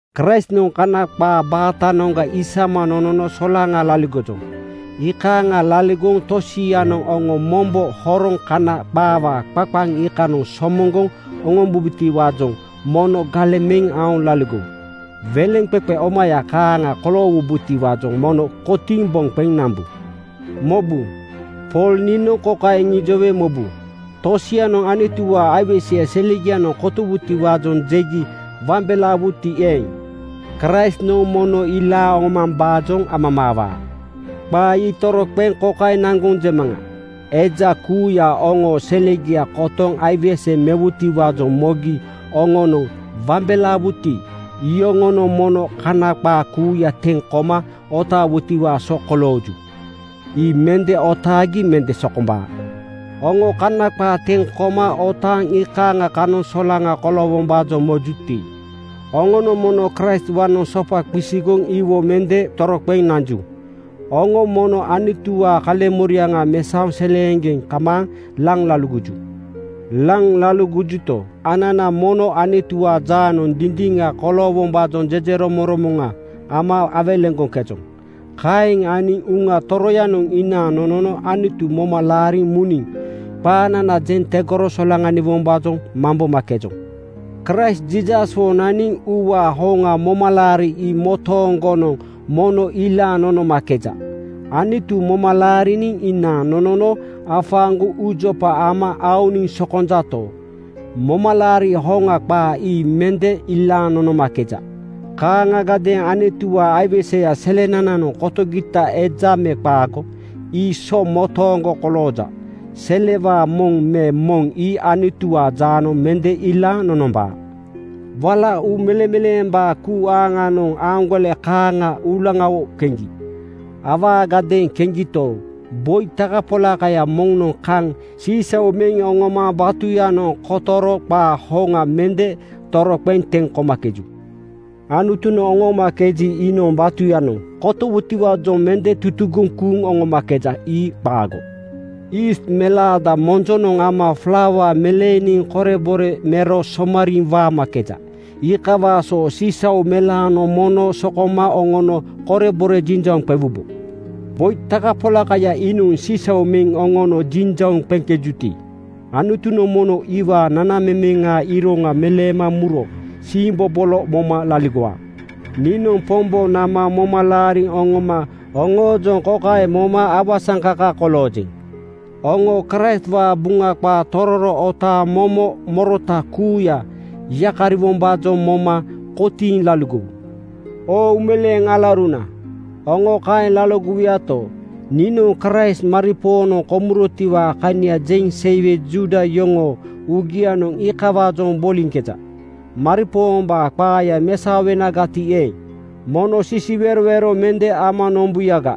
Kraistnoŋ Kana qaa baatanoŋga isama nonono solaŋa laligojoŋ. Iikaaŋa laligoŋ tosianoŋ oŋo mombo horoŋ Kana qaawaa qaqaŋ iikanoŋ somoŋgoŋ oŋombubotiwaajoŋ mono galeŋ meŋ aoŋ laligowu. Weleŋqeqe omaya kaaŋa koloowubotiwaajoŋ mono kotiiŋ boŋ qeŋ nambu. Mobu! Pool niinoŋ kokaeŋ iŋijowe mobu: Tosianoŋ Anutuwaa aiweseya selegianoŋ kotowutiwaajoŋ jegi wambelaawuti eeŋ, Kraistnoŋ mono ilaaŋ oŋomambaajoŋ amamaawaa. Qaa ii toroqeŋ kokaeŋ naŋgoŋ jemaŋa: Eja kuuya oŋoo selegia kotoŋ aiwese mewutiwaajoŋ mogi oŋonoŋ wambelaawuti, iyoŋonoŋ mono Kana qaa kuuya teŋ koma otaawutiwaa so kolooju. Ii mende otaagi mende sokombaa. Oŋo Kana qaa teŋ koma otaaŋ iikaaŋa kanoŋ solaŋa koloowombaajoŋ mojuti, oŋonoŋ mono Kraistwaanoŋ sopa qisigoŋ iwo mende toroqeŋ nanju. Oŋo mono Anutuwaa kaleŋmoriaŋa mesaoŋ seleeŋgeŋ kamaaŋ laŋ laligoju. Laŋ laligojuto, anana mono Anutuwaa jaanoŋ dindiŋa koloowombaajoŋ jejeromoŋromoŋa ama awelegoŋkejoŋ. Kaeŋ aniŋ Uŋa Toroyanoŋ inaaŋ nonono Anutu moma laariŋ muniŋ qaanana jeŋ tegoro solaŋaniwombaajoŋ mambomakejoŋ. Kraist Jiisaswo naniŋ uuwaa hoŋa momalaari ii motooŋgonoŋ mono ilaaŋ nonomakeja. Anutu moma laariniŋ inaaŋ nonono afaaŋgoŋ uujopa ama aoniŋ sokonjato, momalaari hoŋa qaa ii mende ilaaŋ nonomakeja. Kaaŋagadeeŋ Anutuwaa aiweseya selenananoŋ kotogita eja me qaago, ii so motooŋgo kolooja. Selewaa moŋ me moŋ ii Anutuwaa jaanoŋ mende ilaaŋ nonombaa. Wala uu meleŋmeleembaa kuu aaŋnoŋ aaŋgole kaaŋa uulaŋawo keŋgi. Awaagadeeŋ keŋgito, boi takapolakaya moŋnoŋ kaŋ sisau meŋ oŋoma batuyanoŋ kotoro qaa hoŋa mende toroqeŋ teŋ komakeju. Anutunoŋ oŋoomakeji, iinoŋ batuyanoŋ kotowutiwaajoŋ mende tutugoŋ kuuŋ oŋomakeja. Ii qaago. Yiist melaada monjonoŋ ama flauawo meleeniŋ korebore mero somariiŋ waamakeja. Iikawaa so sisau melaanoŋ mono sokoma oŋono korebore jinjauŋ qewubo. Boi takapolakaya iinoŋ sisau meŋ oŋono jinjauŋ amakejuti, Anutunoŋ mono iwaa nanamemeŋaa iroŋa meleema muro siimbobolo moma laligowaa. Niinoŋ Pombo nama moma laariŋ oŋoma oŋoojoŋ kokaeŋ moma awasaŋkaka koloojeŋ: Oŋo Kraistwaa Buŋa qaa tororo otaaŋ momo morota kuuya yakariwombaajoŋ moma kotiiŋ laligowu. Oo uumeleeŋ alauruna, oŋo kaeŋ laligowuyato, niinoŋ Kraist maripoonoŋ komurotiwaa kania jeŋ seiwe Juuda yoŋoo uugianoŋ iikawaajoŋ boliŋkeja. Maripoombaa qaaya mesaowenagati eeŋ, mono sisiwerowero mende ama nombuyaga.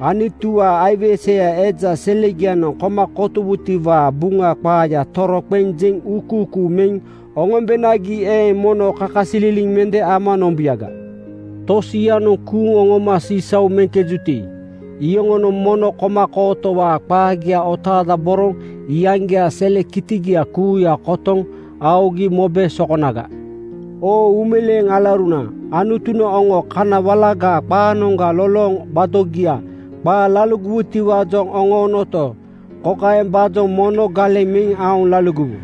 Anutuwaa aiweseya eja selegianoŋ koma kotowutiwaa Buŋa qaaya toroqeŋ jeŋ uukuukuu meŋ oŋombenagi eeŋ, mono kakasililiŋ mende ama nombuyaga. Tosianoŋ kuuŋ oŋoma sisau meŋkejuti, iyoŋonoŋ mono koma kootowaa qaagia otaadaboroŋ iyaŋgiaa sele kitigia kuuya kotoŋ aogi mobe sokonaga. Oo uumeleeŋ alauruna, Anutunoŋ oŋo kana walagaa qaanoŋga lolooŋ gbadogia qaa laligowutiwaajoŋ oŋoonoto, kokaembaajoŋ mono galeŋ meŋ aoŋ laligowu,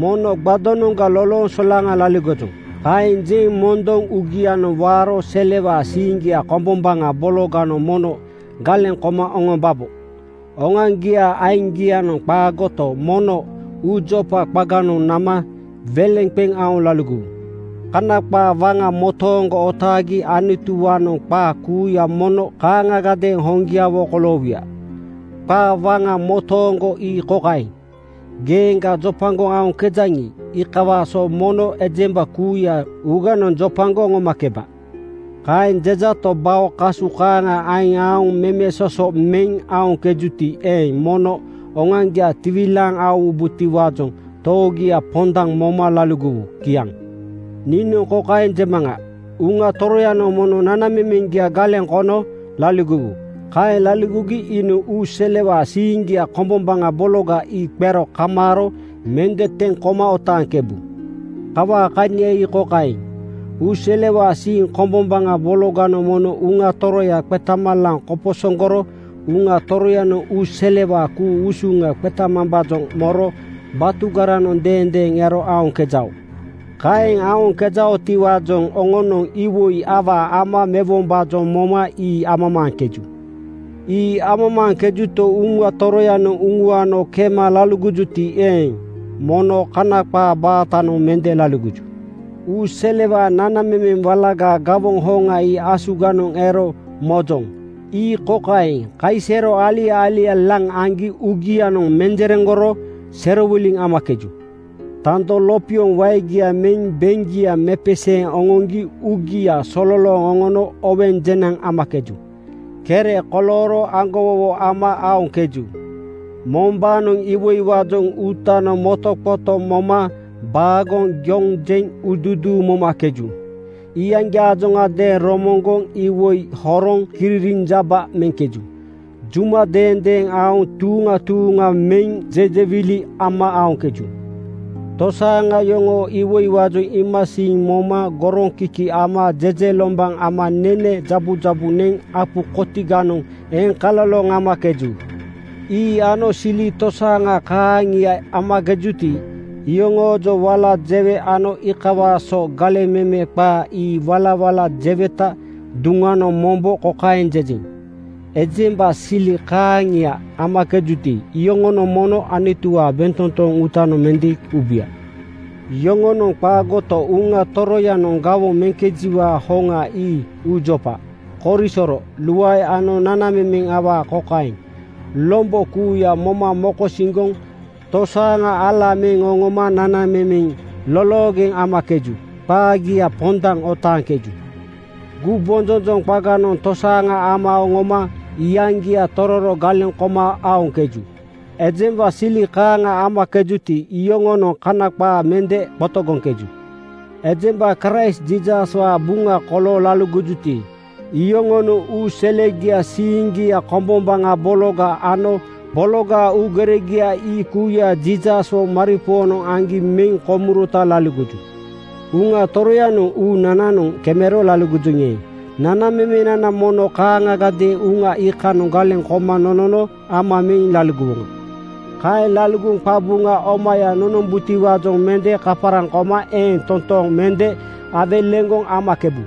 “Mono gbadonoŋga lolooŋ solaŋa laligojoŋ,” kaeŋ jeŋ mondoŋ uugianoŋ waaro selewaa siiŋgia kombombaŋa bologanoŋ mono galeŋ koma oŋombabo. Oŋoaŋgiaa aiŋgianoŋ qaagoto, mono uujopa qaganoŋ nama weleŋ qeŋ aoŋ laligowu. Kana qaa waŋa motooŋgo otaagi Anutuwaanoŋ qaa kuuya mono kaaŋagadeeŋ hoŋgiawo koloowuya. Qaa waŋa motooŋgo ii kokaeŋ, “Geeŋga jopagoŋ aoŋkejaŋi, iikawaa so mono ejemba kuuya uuganoŋ jopagoŋ oŋomakeba.” Kaeŋ jejato, bao kasu kaaŋa aiŋ aoŋ memesoso meŋ aoŋkejuti eeŋ, mono oŋoaŋgia tiwilaaŋ aowubotiwaajoŋ toogia pondaŋ moma laligowu. Kiaŋ. Niinoŋ kokaeŋ jemaŋa: Uŋa Toroyanoŋ mono nanamemeŋgia galeŋ kono laligowu. Kaeŋ laligogi iinoŋ uu selewaa siiŋgia kombombaŋa bologa ii qero kamaaro mende teŋ koma otaaŋkebu. Kawaa kania ii kokaeŋ: Uu selewaa siiŋ kombombaŋa bologanoŋ mono Uŋa Toroya qetama laŋ koposoŋgoro Uŋa Toroyanoŋ uu walagaa ku-usuŋa qemambaajoŋ moro batugaranoŋ deendeeŋ ero aoŋkejao. Kaeŋ aoŋkejaotiwaajoŋ oŋonoŋ iwoi awaa ama mewombaajoŋ moma ii amamaaŋkeju. Ii amamaaŋkejuto, Uŋa Toroyanoŋ uŋuano kema laligojuti eeŋ, mono Kana qaa baatanoŋ mende laligoju. Uu selewaa nanamemeŋ walagaa gawoŋ hoŋa ii asuganoŋ ero mojoŋ. Ii kokaeŋ: Kaisero alia-alia laŋ aŋgi uugianoŋ menjereŋgoro serowiliŋ amakeju. Tando lopioŋ waegia meŋ beŋgia mepeseeŋ oŋoŋgi uugia sololooŋ oŋono oweŋ jenaŋ amakeju. Kere kolooro aŋgowowo ama aoŋkeju. Mombaanoŋ iwoiwaajoŋ uutanoŋ motoqoto moma baagoŋ yoŋ jeŋ uuduuduu momakeju. Iyaŋgiaajoŋadeeŋ romoŋgoŋ iwoi horoŋ kiririnjaba meŋkeju. Juma mendeema aoŋ tuuŋa tuuŋa meŋ jejewili ama aoŋkeju. Tosaaŋa yoŋoo iwoiwaajoŋ iimasiiŋ moma goroŋkiki ama jejelombaŋ ama nene jabujabu neŋ apu kotiganoŋ eŋkaloloŋ amakeju. Ii ano sili tosaaŋa kaaŋia amakejuti, iyoŋoojoŋ wala jewe ano iikawaa so galeŋ meme qaa ii walawala jeweta duŋanoŋ mombo kokaeŋ jejeŋ: Ejemba sili kaaŋia amakejuti, iyoŋonoŋ mono Anutuwaa bentotoŋ uutanoŋ mende ubuya. Yoŋonoŋ qaagoto, Uŋa Toroyanoŋ gawoŋ meŋkejiwaa hoŋa ii uujopa, korisoro, luae ano nanamemeŋ awaa kokaeŋ: Lombo kuuya moma mokosiŋgoŋ tosaaŋa ala meŋ oŋoma nanamemeŋ loloogeŋ amakeju. Qaagia pondaŋ otaaŋkeju. Gumbonjonjoŋ qaganoŋ tosaaŋa ama oŋoma iyaŋgia tororo galeŋ koma aoŋkeju. Ejemba sili kaaŋa amakejuti, iyoŋonoŋ Kana qaa mende qotogoŋkeju. Ejemba Kraist Jiisaswaa buŋa kolooŋ laligojuti, iyoŋonoŋ uu selegiaa siiŋgia kombombaŋa bologa ano bologaa uugeregia ii kuuya Jiisaswo maripoonoŋ aŋgi meŋ komurota laligoju. Uŋa Toroyanoŋ uunananoŋ kemero laligojoŋi eeŋ, nanamemenana mono kaaŋagadeeŋ Uŋa iikanoŋ galeŋ koma nonono ama meŋ laligowoŋa. Kaeŋ laligoŋ qabuŋa omaya nonombutiwaajoŋ mende kaparaŋ koma eeŋ totooŋ mende awelegoŋ aoŋkebu.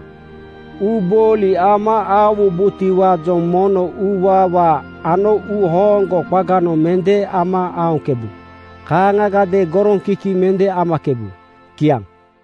Uubooli ama aowubotiwaajoŋ mono uuwaawaa ano uuhooŋgo qaganoŋ mende ama aoŋkebu. Kaaŋagadeeŋ goroŋkiki mende amakebu. Kiaŋ.